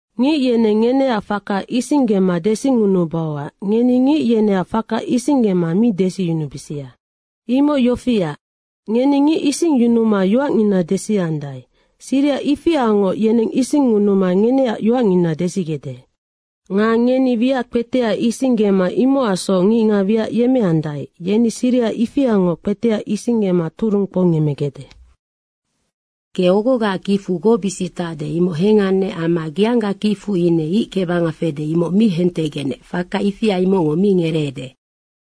“Ngic yeneng ngeneac faka isinggema desingunubauac ngeni ngic yeneac faka isinggema mi desiyunubisia. Imoc yofiac, ngeni ngic isingyunuma yoacngina desiandae, siriha ifiangoc yeneng isingngunuma ngeneac yoacngina desigecde. Nga ngeni wiac kpetea isinggema imocacsoc ngicngac wiac yemmeandae, yeni siriha ifiangoc kpetea isinggema turung kpoungemmegecde. Ge ogogaac kicfu gocbisic tacde, imoc hengannec amma geangga kicfu ine ic kebanga fede, imoc mi hentegecnec, faka ifia imocngo mi ngereede.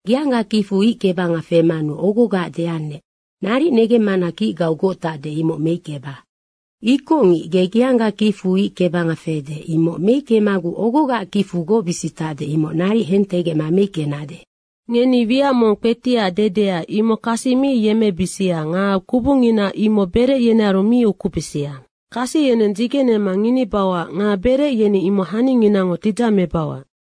Geangga kicfu ic kebanga femanu ogogaac deannec, ‘Naric negemmana kicgau goc tacde, imoc meickeba.’ Ikocngic, ge geangga kicfu ic kebanga fede, imoc meickemaguc ogogaac kicfu gocbisic tacde, imoc naric hentegecma meickenade. Ngeni wiac mong kpetiac dedea, imoc kasi mi yemmebisia nga kubungina imoc berec yenearu mi ukubisia. Kasi yeneng dzigenema nginibauac nga berec yeni imoc haninginango tidzamebauac.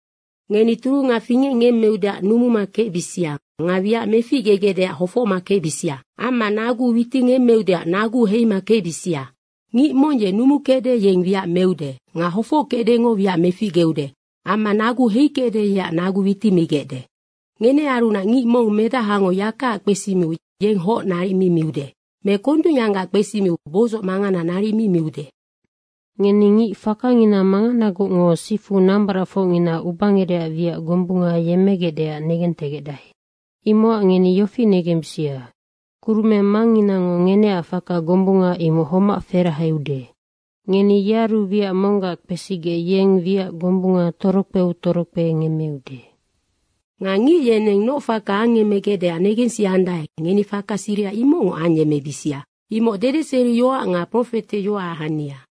Ngeni turunga fingecngemmeudeac numuma kecbisia nga wiac meficgegecdeac hofocma kecbisia. Amma nagu witingemmeudeac naguu heima kecbisia. Ngic mong ye numukecde, yeng wiac meude nga hofockecdengo wiac meficgeude amma naguu heikecde, yeac nagu witimigecde. Ngenearunac ngic mong medahango yakaac kpesimiu yeng hoc naric mi miude. Me kondungyanggac kpesimiu boidzoc mangana naric mi miude. Ngeni ngic fakangina manganagocngo sifu nambaracfocngina ubangerecac wiac gombunga yemmegecdeac negentegecdae. Imocac ngeni yofi negembisia, Kurumeng Mangnginango ngeneac faka gombunga imoc homac ferahaude. Ngeni yearu wiac monggac kpesigec yeng wiac gombunga torokpeu torokpe ngemmeude. Nga ngic yeneng noc faka angemmegecdeac negensiandae, ngeni faka siriha imocngoc ayemmebisia. Imocnoc dedeseriyoac nga profeteyoacac hania.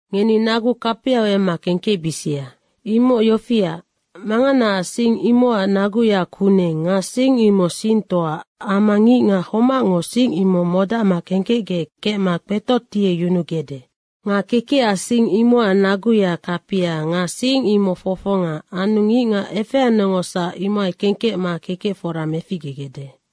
Ngeni nagu kapiau emma kengkecbisia. Imoc yofiac, manganaac sing imocac naguya kuneng nga sing imoc singtoa amma ngicngac homacngo sing imoc modacma kengkecgec kecma kpetotieyunugecde. Nga kekecac sing imocac naguya kapia nga sing imoc fofonga anu ngicngac efeanecngosac imohai kengkecma kekec fora meficgegecde.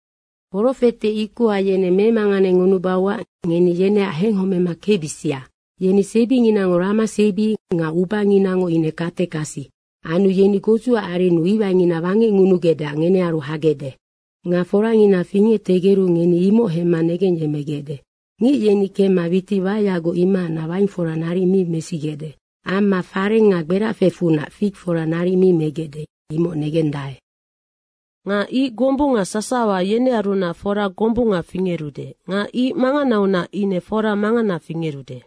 Profete ikoha yeneng memanganengunubauac ngeni yeneac henghomema kecbisia. Yeni sebinginango rama sebi nga ubanginango ine katekasi anu yeni godzuac arennu iwaingina wangecngunugecdeac ngenearu hagecde. Nga forangina fingectegeru, ngeni imoc hemma negengyemmegecde. Ngic yeni kemma witic waeyagoc, imohacnac waing fora naric mi mesigecde. Amma fareng nga gberafecfunac fig fora naric mi megecde, imoc negendae. Nga ic gombunga sasawa, yenearunac fora gombunga fingerude nga ic manganaunac ine fora mangana fingerude.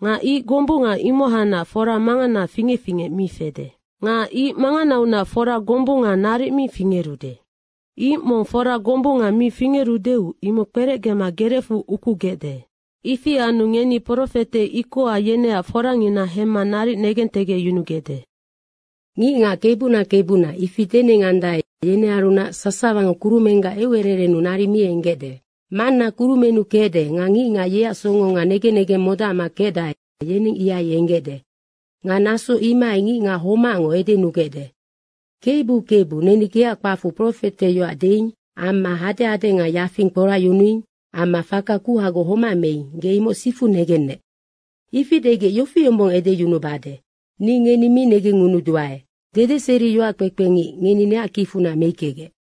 Nga ic gombunga imohacnac fora mangana fingec fingec mi fede. Nga ic manganaunac fora gombunga naric mi fingerude. Ic mong foraya gombunga mi fingerudeu imoc kperecgema gerecfu ukugecde. Ifi anu ngeni profete ikoha yeneac forangina hemma naric negentegecyunugecde. ‘Ngicngac Kebuna, Kebuna.’ ifi denengandae, yenearunac sasawango kurumenggac eucererennu naric mi enggecde. Manna kurumennu kecde nga ngicngac yeac songo nga negen negeng modacma kecdae, yeneng ihai enggecde. Nga naso imohai ngicngac homacngo edenugecde, ‘Kebu, Kebu, neni geac kpacfu profeteyoac deing amma hadehade nga yafing kporacyunuing amma faka kuhagoc homac meing, ge imoc sifu negennec.’ Ifi degec yofi yombong edeyunubade, ‘Ni ngeni mi negengngunuduae. Dedeseriyoac kpekpengic, ngeni neac kicfunac meickegec.’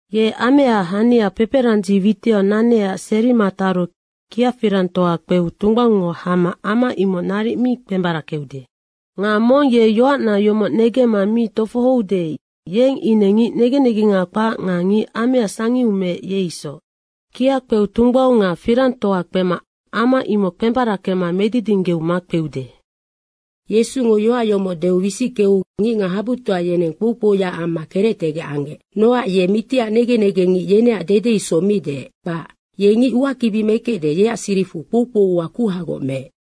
Ye ameaac hania peperandzi witiau nanecac serima taru kiafirangtoa kpeu tungbaungngo hama ama imoc naric mi kpembarackeude. Nga mong ye yoacna yomoc negemma mi tofohoude, yeng ine ngic negen negenga kpac nga ngic amea sangiu meec, ye isoc. Kia kpeu tungbaung nga firangtoa kpema ama imoc kpembarackema medidinggeu makpeude.” Yesungo yoac yomoc deu wisickeu ngicngac habutoa yeneng kpoukpouyaac amma kerectegec anggec. Nocac yeng mitiac negen negengngic yeneac dede isoc mi deec, kpac. Ye ngic uakibi mekecde, yeac siricfu kpoukpou ua kuhagoc meec.